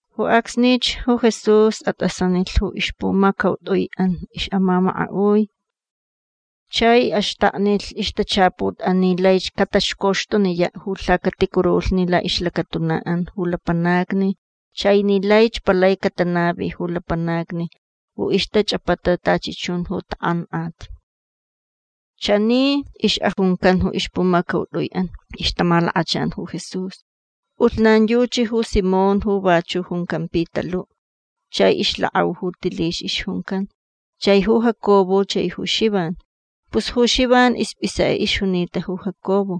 Ju acsnich ju Jesús at'asanilh ju ixpumacaut'ui'an ix'amamaka'ui chai axtaknilh ixtachaput'an ni laich cataxcoxtuniya' ju lhacaticurulhni la'ixlacatuna'an ju lapanacni chai ni laich palai catanavi ju lapanacni ju ixtach'apata tachi chun ju tak'ank'at. Chani ix'ajuncan ju ixpumacaut'ui'an ixtamalakachan ju Jesús. P'ulhnan yuchi ju Simón ju vachu' juncan Pitalu'. Chai ixlak'au ju Tilix ixjuncan. Chai ju Jacobo chai ju Xivan. Pus ju Xivan isp'isek'e ixjunita ju Jacobo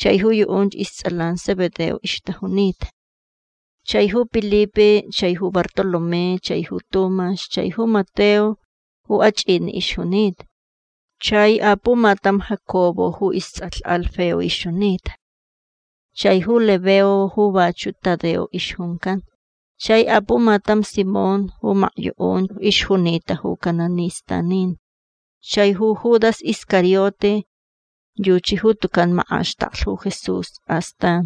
chai ju yu'unch ists'alan Zebedeo ixtajunita. Chai ju Pilipe chai ju Bartolomé chai ju Tumax chai ju Mateo ju ach'ini' ixjunita. Chai apumatam Jacobo ju ists'alh Alfeo ixjunita. Chai ju Lebeo ju vachu' Tadeo ixjuncan. Chai apumatam Simón ju makyu'unch ixjunita ju cananistanin. Chai ju Judas Iscariote. Yuchi ju tucan mak'axtaklh ju Jesús astan.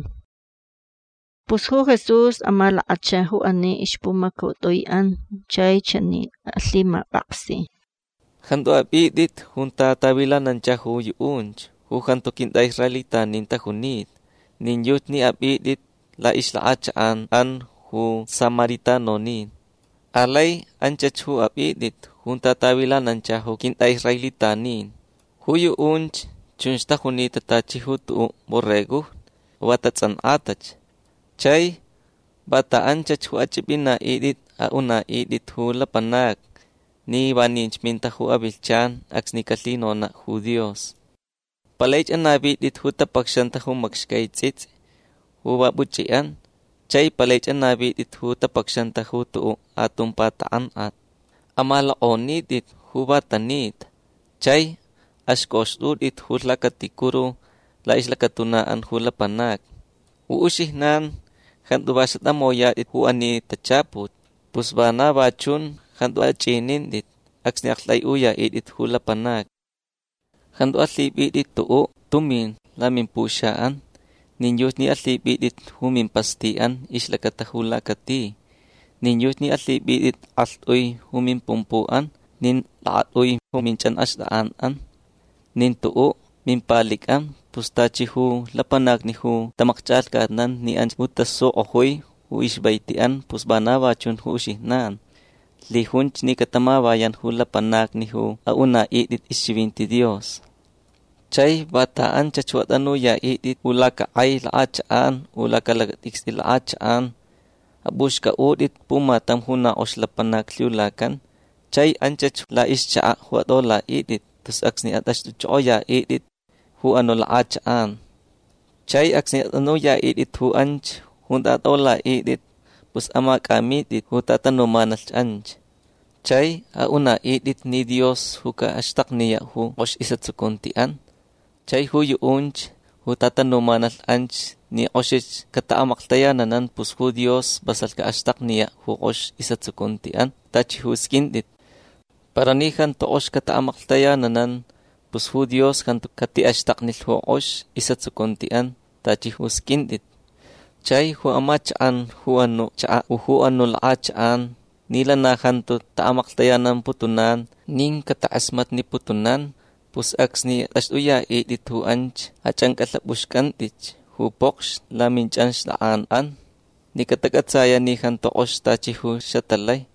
Pus ju Jesús amalakacha ju ani ixpumacaut'ui'an chai chani alhimap'aksi: ―Jantu ap'it'it junta tavilanancha ju yu'unch ju jantu quint'a'israelitanin tajunita. Nin yuchi ni ap'it'it la'ixlak'achak'an'an ju samaritanonin. Alai anchach ju ap'it'it junta tavilanancha ju quint'a'israelitanin. Ju yu'unch chunch tajunita tachi ju tu'u' borregojni ju va tats'ank'atach. Chai vanta anchach ju ach'ip'ina'it'it a'una'it'it ju lapanacni ni vaninch minta ju avilhchan acsni calhinona' ju Dios. Palaich anavit'it ju tapacxanta ju macxcai ts'its'i ju va puch'i'an. Chai palaich anavit'it ju tapacxanta ju tu'u' atumpa tak'ank'at. Amalok'onit'it ju va tanita. Chai axc'oxt'ut'it ju lhacaticuru la'ixlacatuna'an ju lapanacni. Ju uxijnan jantu va xatamoyat'it ju ani tachaput. Pus vana va chun jantu ach'inint'it acsni a'akt'ai'uya'it'it ju lapanacni. Jantu alhip'it'it tu'u' tumin lamimpuxa'an. Nin yuchi ni alhip'it'it ju mimpasti'an ixlacata ju lacati. Nin yuchi ni alhip'it'it k'alht'ui ju mimpumpu'an nin lakat'ui ju minch'anxt'ak'an'an. Nin tu'u' mimpalic'an. Pus tachi ju lapanacni ju tamakch'alhcatnan ni anch ju tasuk'ojui ju ixvaiti'an pus vana va chun ju uxijnan. Lhijunch ni catamavayan ju lapanacni ju a'una'it'it ixchivinti Dios. Chai vanta anchach ju at'anuya'it'it u lacak'ai lak'achak'an u lacalacat'icst'i lak'achak'an ap'uxc'a'ut'it pumatam ju na k'ox lapanac lhiulacan. Chai anchach la'ixchaka' ju at'ola'it'it tus acsni at'axt'uch'ok'oya'it'it ju anu' lak'achak'an. Chai acsni at'anuya'it'it ju anch junta at'ola'it'it pus amac'amit'it ju tatanumanalh anch. Chai a'una'it'it ni Dios ju ca'axtakniya' ju k'ox is'atsucunti'an. Chai ju yu'unch ju tatanumanalh anch ni k'oxich cata'amaklhtayananan pus ju Dios vasalh ca'axtakniya' ju k'ox is'atsucunti'an tachi ju sq'uint'it. Para ni jantu k'ox cata'amaklhtayananan pus ju Dios jantu cati'axtaknilh ju k'ox is'atsucunti'an tachi ju sq'uint'it. Chai ju amachak'an ju anu' chaka' u ju anu' lak'achak'an ni lana jantu ta'amaklhtayanamputunan nin catak'asmatniputunan pus acsni at'axt'uya'it'it ju anch ach'anc'alhap'uxc'ant'itch ju pokxni laminch'anxt'ak'an'an ni catac'atsaya' ni jantu k'ox tachi ju xatalai.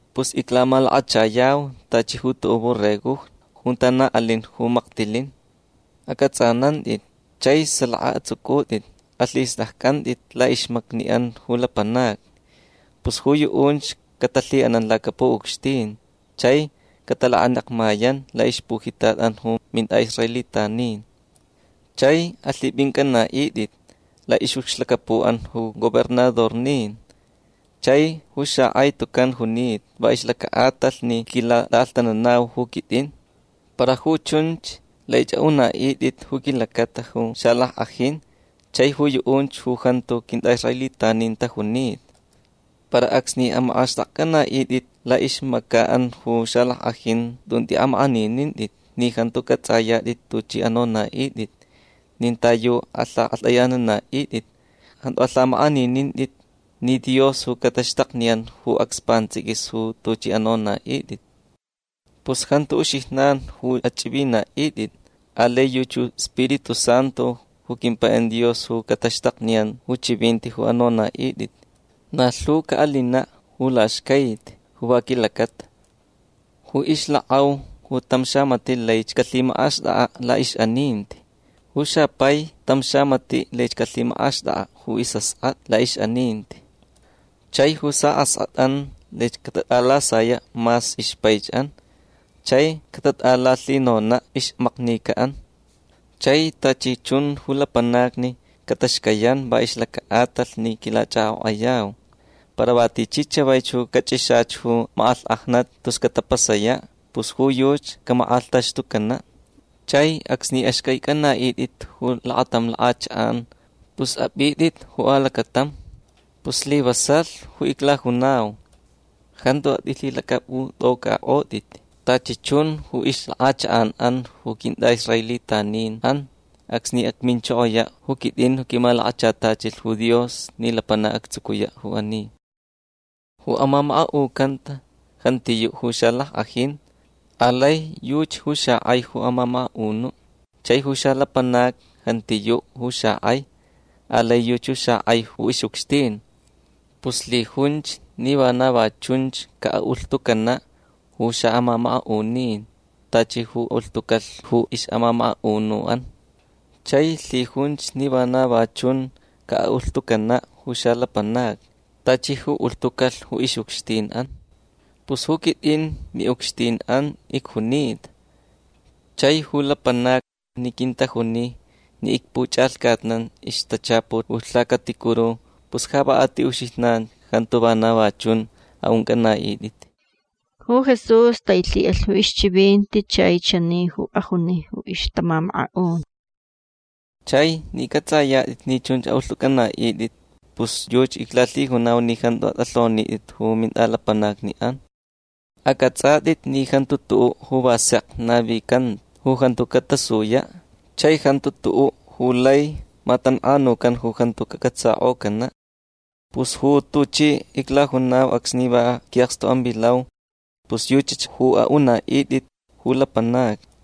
Pus iclamalakachayau tachi ju tu'u' borregojni junta na alin ju maktilin. Ac'ats'anant'it. Chai salaka ats'uc'ut'it. Alhist'acc'ant'it la'ixmacni'an ju lapanacni. Pus ju yu'unch catalhi'anan lacapu'ucxtin. Chai catalakanekmayan la'ixpujitat'an ju mint'a'israelitanin. Chai alhip'inc'ana'it'it la'ix'ucxlacapu'an ju gobernadornin chai ju xak'ai tucan junita va ixlaca'atalh ni quilat'a'alhtananau ju quit'in. Para ju chunch laich a'una'it'it ju quilacata ju xalack'ajin chai ju yu'unch ju jantu quint'a'israelitanin tajunita. Para acsni amak'axt'akc'ana'it'it la'ixmaca'an ju xalack'ajin tun t'i'amak'aninint'it ni jantu c'ats'ayat'it tuch'i anona'it'it nin ta yu alhak'alht'ayanana'it'it. Jantu alhamak'aninint'it ni Dios ju cataxtakniyan ju acs pants'iquis ju tuch'i anona'it'it. Pus jantu uxijnan ju ach'ivina'it'it. Alai yuchi ju iSpiritu Santu ju quimpai'an Dios ju cataxtakniyan ju chivinti ju anona'it'it. Na lhu ca'alina' ju laxcaiti ju va quilacata. Ju ixlak'au ju tam xamati' laich calhimak'axt'ak'a' la'ix'aninti. Ju xapai tam xamati' laich calhimak'axt'ak'a' ju is'ask'at'a la'ix'aninti. Chai ju sa'ask'at'an laich catat'alasaya' mas ixpaich'an chai catat'alalhinona' ixmaknica'an. Chai tachi chun ju lapanacni cataxcayan va ixlaca'atalh ni quilach'ak'ok'ayau. Para va tichi chavaich ju cach'ixach ju mak'alhk'ajnat tus catapasaya' pus ju yuchi camak'alhtaxtucana'. Chai acsni axc'aic'ana'it'it ju lakatam lak'achak'an pus ap'it'it ju alacatam. Pus slivasalh ju iclajunau. Jantu at'ilhilac'ap'ut'oc'ak'ot'it tachi chun ju ixlak'achak'an'an ju quint'a'israelitanin'an acsni acminchokoya' ju quit'in ju quimalakachatachilh ju Dios ni lapanac actsucuya' ju ani. Ju amamaka'ucanta jantiyu' ju xalack'ajin. Alai yuchi ju xak'ai ju amamaka'unu'. Chai ju xalapanac jantiyu' ju xak'ai. Alai yuchi ju xak'ai ju ix'ucxtin. Pus lhijunch ni vana va chunch ca'a'ulhtucana' ju xa'amamaka'unin tachi ju ulhtucalh ju ix'amamaka'unu'an. Chai lhijunch ni vana va chun ca'a'ulhtucana' ju xalapanacni tachi ju ulhtucalh ju ix'ucxtin'an. Pus ju quit'in mi'ucxtin'an icjunita. Chai ju lapanacni ni quintajuni ni icpuch'alhcatnan ixtachaput ju lhacaticuru pus ja va a ti uxijnan jantu vana va chun a'unc'ana'it'it. Ju Jesús tailhi'alh ju ixchivinti chai chani ju ajuni ju ixtamamaka'un: ―Chai ni c'ats'ayat'it ni chunch ju a'ulht'uc'ana'it'it pus yuchi iclalhijunau ni jantu at'alhonit'it ju mint'alapanacni'an. Ac'ats'at'it ni jantu tu'u' ju va sek navicanta ju jantu catasuya'. Chai jantu tu'u' ju lai matank'anucan ju jantu cac'atsak'ocana'. Pus ju tuchi iclajunau acsni va qui'akstu'an vilau pus yuchach ju a'unit'it ju lapanacni.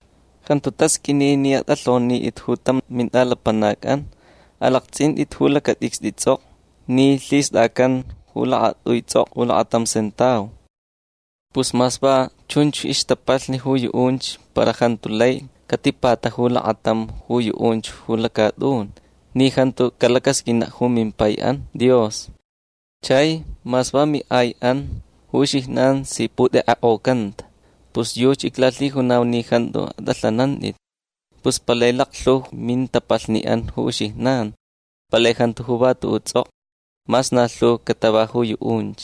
Jantu tasq'uini ni at'alhonit'it ju tam mint'alapanac'an. Alakts'int'it ju lacat'icst'i ts'ok'o ni lhist'acan ju lakat'ui ts'ok'o lakatam sentau. Pus mas va chunch ixtapalh ju yu'unch para jantu lai catipataju lakatam ju yu'unch ju lacat'un ni jantu calacasq'uina' ju mimpai'an Dios. Chai mas va mi'ai'an ju uxijnan si put'ek'ek'ocanta. Pus yuchi iclalhijunau ni jantu at'alhanant'it. Pus palai laklhu ju mintapalhni'an ju uxijnan. Palai jantu ju va tu'u' ts'ok'o mas na lhuch catava ju yu'unch.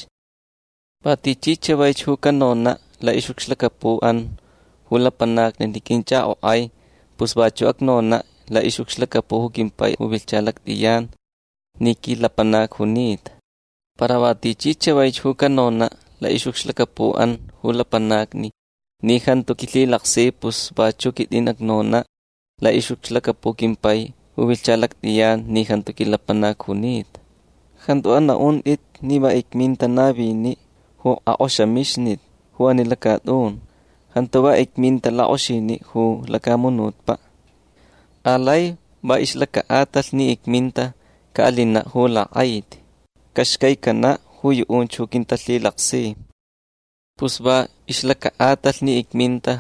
Va tichi chavaich ju canona' la'ix'ucxlacapu'an ju lapanacni ni quinch'ak'ok'ai pus vachu' acnona' la'ix'ucxlacapu' ju quimpai ju vilhcha lact'iyan ni quilapanac junita. Para va tichi chavaich ju canona' la'ix'ucxlacapu'an ju lapanacni ni jantu quilhilaksich pus vachu' quit'in acnona' la'ix'ucxlacapu' quimpai ju vilhcha lact'iyan ni jantu quilapanac junita. Jantu ana'unt'it ni va icminta navini' ju ak'oxamixnit ju ani lacat'un. Jantu va icminta lak'oxini' ju lacamunutpa'. Alai va ixlaca'atalh ni icminta ca'alina' ju lak'aiti. Caxcaicana' ju yu'unch ju quintalhilaksi. Pus va ixlaca'atalh ni icminta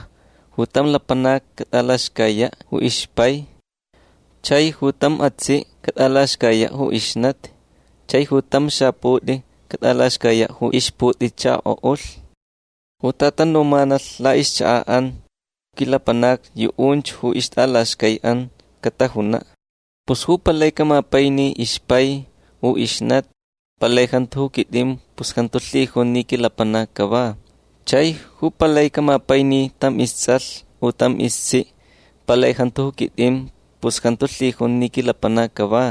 ju tam lapanac cat'alaxcaya' ju ixpai. Chai ju tam atsi' cat'alaxcaya' ju ixnati. Chai ju tam xaput'i cat'alaxcaya' ju ixput'ichako'ulh. Ju tatanumanalh la'ixchaka'an ju quilapanacni yu'unch ju ixt'alaxcai'an catajuna'. Pus ju palai camapaini ixpai u ixnati palai jantu ju quit'in pus jantu lhijun ni quilapanac cava. Chai ju palai camapaini tam ists'alh u tam istsi' palai jantu ju quit'in pus jantu lhijun ni quilapanac cava.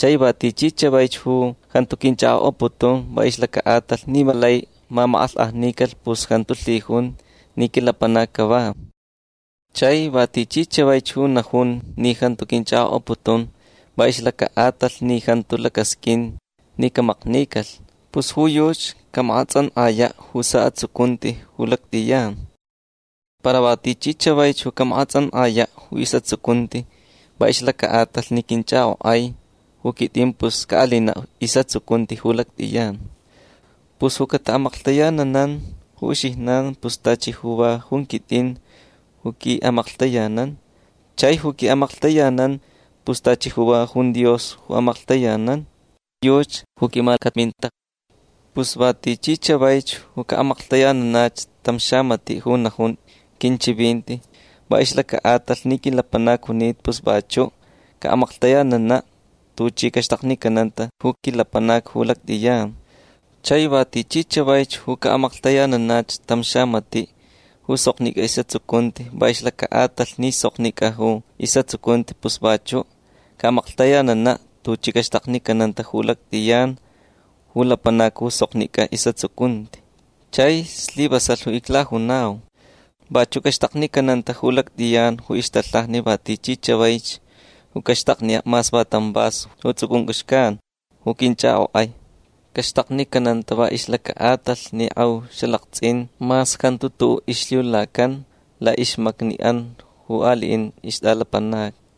Chai va tichi chavaich ju jantu quinch'ak'ok'aputun va ixlaca'atalh ni va lai mamak'alhk'ajnicalh pus jantu lhijun ni quilapanac cava. Chai va tichi chavaich ju najun ni jantu quinch'ak'ok'aputun va ixlaca'atalh ni jantu lacasq'uin ni camaknicalh pus ju yuchi camak'ats'ank'aya' ju sa'atsucunti ju lact'iyan. Para va tichi chavaich ju camak'ats'ank'aya' ju is'atsucunti va ixlaca'atalh ni quinch'ak'ok'ai ju quit'in pus ca'alina' is'atsucunti ju lact'iyan. Pus ju cata'amaklhtayananan ju uxijnan pus tachi ju va jun quit'in ju qui'amaklhtayanan. Chai ju qui'amaklhtayanan pus tachi ju va jun Dios ju amaklhtayanan. Yuchi ju quimacaminta. Pus va tichi chavaich ju ca'amaklhtayananach tam xamati' ju najun quinchivinti va ixlaca'atalh ni quilapanac junita pus vachu' ca'amaklhtayanana' tuchi caxtaknicananta ju quilapanac ju lact'iyan. Chai va tichi chavaich ju ca'amaklhtayananach tam xamati' ju soknic'a is'atsucunti va ixlaca'atalh ni soknic'a ju is'atsucunti pus vachu' ca'amaklhtayanana' tuchi caxtaknicananta ju lact'iyan ju lapanac ju soknic'a is'atsucunti. Chai slivasalh ju iclajunau. Vachu' caxtaknicananta ju lact'iyan ju ixtalhaja va tichi chavaich ju caxtakniya' mas va tam vaso ju ts'uc'unc'u xcan ju quinch'ak'ok'ai. Caxtaknicananta va ixlaca'atalh ni k'eu xalakts'in mas jantu tu'u' ixlhiulacan la'ixmacni'an ju ali'in ixt'alapanacni.